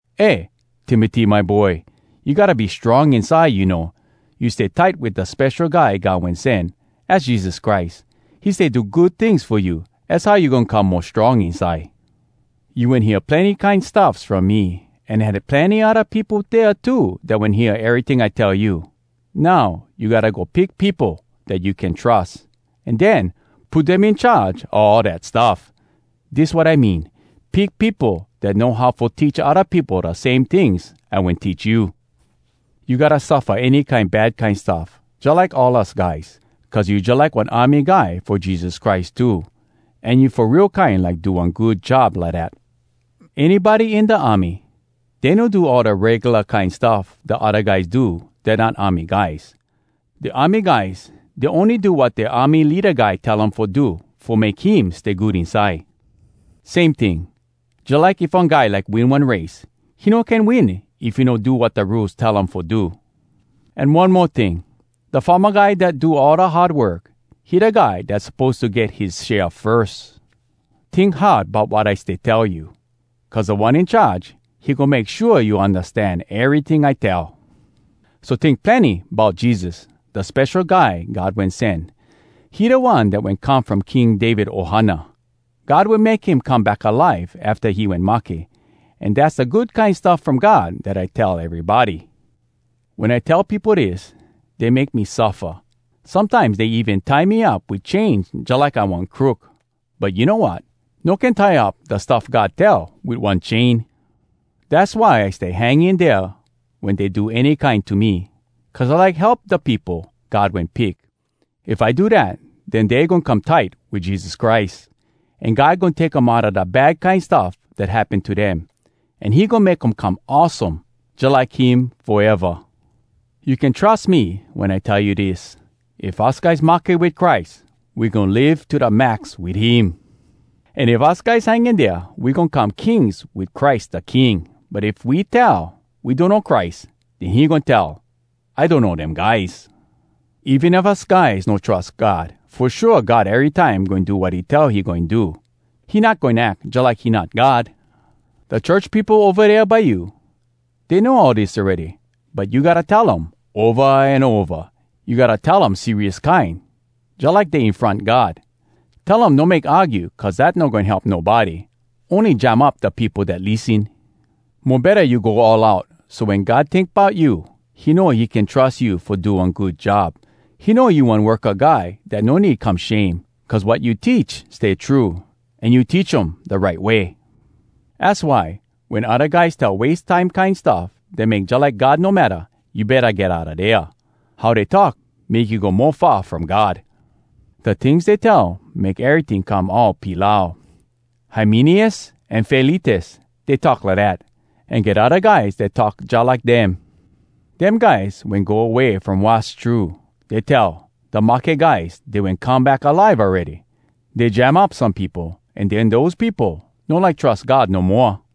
Eh, Timoty my boy! You gotta be strong inside, you know! You stay tight wit da Spesho Guy God Wen Sen, az Jesus Christ. He stay do good tings fo you. Az how you goin come mo strong inside. You wen hear plenny kine stuffs from me, an had plenny odda peopo dea too dat wen hear eryting I tell you. Now, you gotta go pick peopo dat you can trus, an den, put dem in charge a all dat stuff. Dis wat I mean, pick peopo dat know how fo teach odda peopo da same tings I wen teach you. You gotta suffa any kine bad kine stuff, jalike all us guys. Cuz you jalike one army guy fo Jesus Christ too, an you fo real kine like do one good job lidat. Anybody in da army, dey no do all da regula kine stuff da odda guys do dat not army guys. Da army guys, dey ony do wat dea army leada guy tell um fo do fo make him stay good inside. Same ting, jalike if one guy like win one race, he no can win if he no do wat da rules tell um fo do. An one mo ting, da farma guy dat do all da hard work, he da guy dat suppose to get his share firs. Tink hard bout wat I stay tell you. Cuz Da One In Charge, he goin make shua you undastan eryting I tell. So tink plenny bout Jesus, da Spesho Guy God Wen Sen. He da One dat wen come from King David ohana. God wen make him come back alive afta he wen mahke. An dass da Good Kine Stuff From God dat I tell erybody. Wen I tell peopo dis, dey make me suffa. Sometimes dey even tie me up wit chains jalike I one crook. But you know wat? No can tie up da stuff God tell wit one chain! Dass why I stay hang in dea wen dey do any kine to me—cuz I like help da peopo God wen pick. If I do dat, den dey goin come tight wit Jesus Christ, an God goin take um outa da bad kine stuff dat happen to dem. An he goin make um come awesome jalike him foeva. You can trus me wen I tell you dis: “If us guys mahke wit Christ, We goin live to da max wit him! An if us guys hang in dea, We goin come kings wit Christ da King! But if we tell, ‘We donno Christ!’ Den he goin tell, ‘I donno dem guys!’ Even if us guys no trus God, Fo shua God erytime goin do wat he tell he goin do. He not goin ack jalike he not God!” Da church peopo ova dea by you, dey know all dis awready, but you gotta tell um, ova an ova. You gotta tell um serious kine, jalike dey in front God. Tell um no make argue cuz dat no goin help nobody. Ony jam up da peopo dat lissen. Mo betta you go all out, so wen God tink bout you, he know he can trus you fo do one good job. He know you one worka guy dat no need come shame, cuz wat you teach stay true, an you teach um da right way. Az why, wen odda guys tell wase time kine stuff dat make jalike God no matta, you betta get outa dea. How dey talk, make you go mo far from God. Da tings dey tell make eryting come all pilau. Hymeneus an Filetus, dey talk lidat, an get odda guys dat talk jalike dem. Dem guys wen go away from wass true. Dey tell, “Da mahke guys, dey wen come back alive awready.” Dey jam up some peopo, an den dose peopo no like trus God no moa.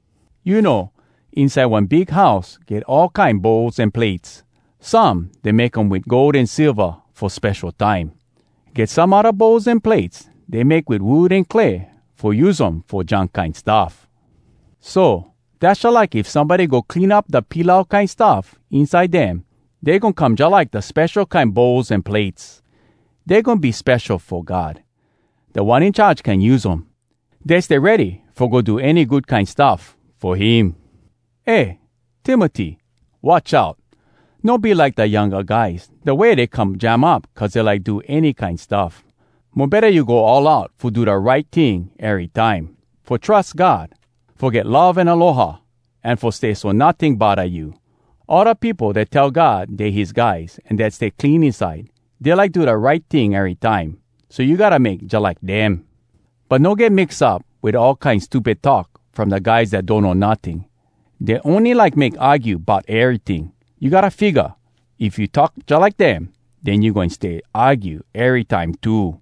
You know, inside one big house get all kine bowls an plates. Some, dey make um wit gold an silva fo spesho time. Get some odda bowls an plates dey make wit wood an clay fo use um fo junk kine stuff. So, dass jalike if somebody go clean up da pilau kine stuff inside dem, dey goin come jalike da spesho kine bowls an plates—dey goin be spesho fo God. Da One In Charge can use um. Dey stay ready fo go do any good kine stuff fo him. Eh Timoty! Watch out! No be like da younga guys, da way dey come jam up cuz dey like do any kine stuff. Mo betta you go all out fo do da right ting erytime, fo trus God, fo get love an aloha, an fo stay so notting bodda you. All da peopo dat tell God dey his guys, an dat stay clean inside, dey like do da right ting erytime—so you gotta make jalike dem. But no get mix up wit all kine stupid talk from da guys dat donno notting. Dey ony like make argue bout eryting. You gotta figga, if you talk jalike dem, den you goin stay argue erytime too.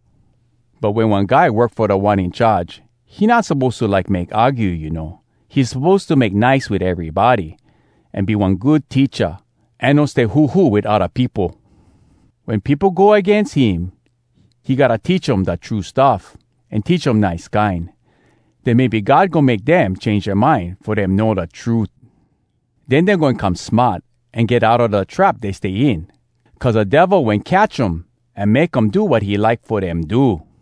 But wen one guy work fo Da One In Charge, he not suppose to like make argue, you know. He suppose to make nice wit erybody, an be one good teacha, an no stay huhu wit odda peopo. Wen peopo go agains him, he gotta teach um da true stuff, an teach um nice kine. Den maybe God goin make dem change dea mind fo dem know da trut. Den dey goin come smart an get outa da trap dey stay in, cuz da Devil wen catch um an make um do wat he like fo dem do.